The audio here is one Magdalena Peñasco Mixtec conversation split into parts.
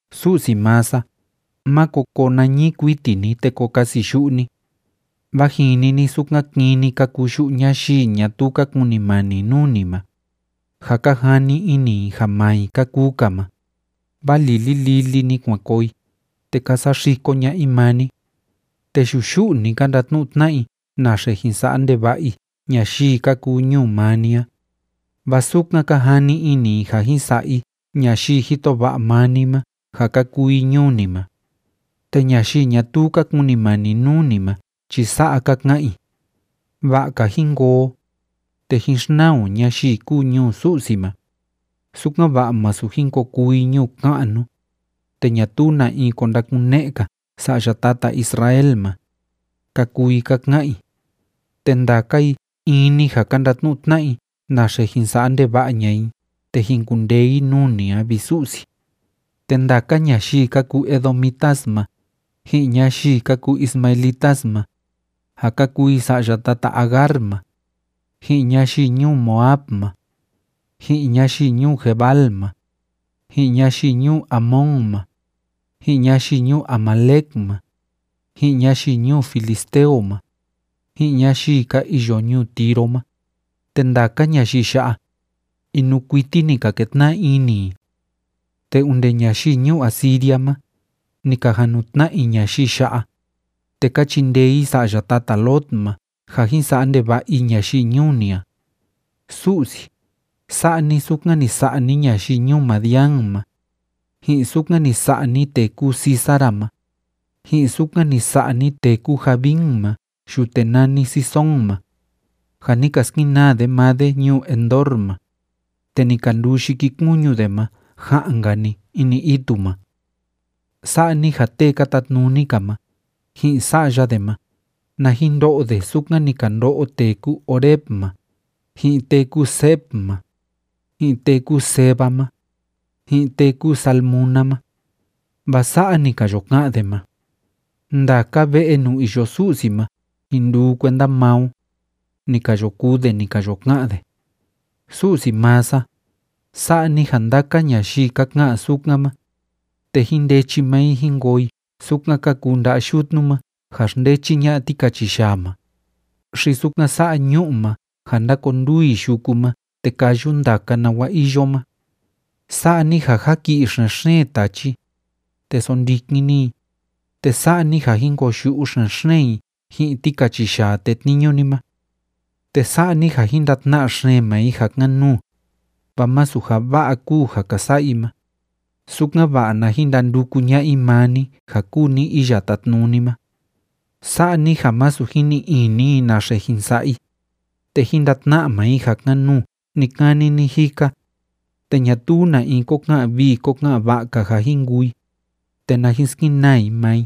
Su'si maa sa, máko koo nañii kuiti ni te ko kasiyu'u ni. Vaa jini ni sukan kini ka kuu yu'u ñayii ñatuu ka kunimani nuu ni ma, ja ka jani ini i ja maa i ka kuu‑ka ma, vaa lili lili‑ni kuan koo i, te ka saxiko ña'a i maa ni. Te yuyu'u‑ni ka ndatnu'u tna'a i naxe jin sa'a ndeva'a i ñayii ka kuu ñuu maa ni a, vaa sukan ka jani ini i ja jin sa'a i ñayii jito va'a maa ni ma ja ka kuu i ñuu ni ma. Te ñayii ñatuu ka kunimani nuu ni ma chi sa'a ka ka'an i: “Va'a‑ka jín koo o, te jín xnaa o ñayii kúu ñuu Su'si ma, sukan‑va'a masu jin ko kuu i ñuu ka'nu, te ñatuu na in ko ndakune'e‑ka sa'ya tata Israel ma”, ka kuu i ka ka'an i. Te ndaka i in‑ni ja ka ndatnu'u tna'a i naxe jin sa'a ndeva'a ña'a i te jin kundee i nuu ni a, vi Su'si. Te ndaka ñayii ka kuu edomitas ma, ji'in ñayii ka kuu ismaelitas ma, ja ka kuu i sa'ya tata Agar ma, ji'in ñayii ñuu Moab ma, ji'in ñayii ñuu Gebal ma, ji'in ñayii ñuu Amón ma, ji'in ñayii ñuu Amalec ma, ji'in ñayii ñuu filisteo ma, ji'in ñayii ka iyo ñuu Tiro ma, te ndaka ñayii ya'a, inuu kuiti ni ka ketna'a ini i. Te onde ñayii ñuu Asiria ma, ni ka jan nu tna'a i ñayii ya'a, te ka chindee i sa'ya tata Lot ma ja jin sa'a ndeva'a i ñayii ñuu ni a. Su'si, sa'a ni sukan ni sa'a ni ñayii ñuu Madián ma, ji'in sukan ni sa'a ni tee kúu Sísara ma, ji'in sukan ni sa'a ni tee kúu Jabín ma yute nani Cisón ma, ja ni ka skenaa de maa de ñuu Endor ma, te ni ka nduu yikikuñu de ma ja'an‑nka‑ni ini itu ma. Sa'a ni ja tee ka tatnuni‑ka ma, ji'in sa'ya de ma, na jin ndo'o de sukan ni ka ndo'o tee kúu Oreb ma, ji'in tee kúu Zeeb ma, ji'in tee kúu Zeba ma, ji'in tee kúu Zalmuna ma. Vaa sa'a ni ka yo ka'an de ma: “Ndaka ve'e nuu iyo Su'si ma jin nduu kuenda maa o”, ni ka yo kuu de ni ka yo ka'an de. Su'si maa sa, sa'a ni ja ndaka ñayii ka ka'an sukan ma, te jín ndechi maa i jín koo i sukan ka kuu nda'a yutnu ma ja xndechi ña'a tikachiyaa ma, xi sukan sa'a ñu'u ma ja ndákonduu i yuku ma te káyu ndaka nawa iyo ma. Sa'a ni ja jáki'i xen‑xeen tachi, te sondikin ni i, te sa'a ni ja jín koyu'u xen‑xeen i ji'in tikachiyaa tetniñu ni ma. Te sa'a ni ja jín ndatna'a xeen maa i ja kan‑nuu, vaa masu ja va'a kúu ja ka sa'a i ma, sukan‑va'a na jin ndanduku ña'a i maa ni ja kúu ni Iya Tátnuni ma. Sa'a ni ja másu jin ni'i ini i naxe jin sa'a i, te jín ndatna'a maa i ja kan‑nuu ni‑kani ni‑jika, te ñatuu na in kó ka'an vii kó ka'an va'a‑ka ja jin kuu i, te na jin skenaa i maa i.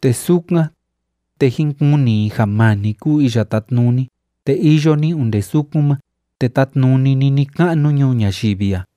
Te sukan, te jín kuni i ja maa ni kúu Iya Tátnuni te iyo ni onde sukun ma te tátnuni ni ni‑ka'nu ñuu ñayivi a.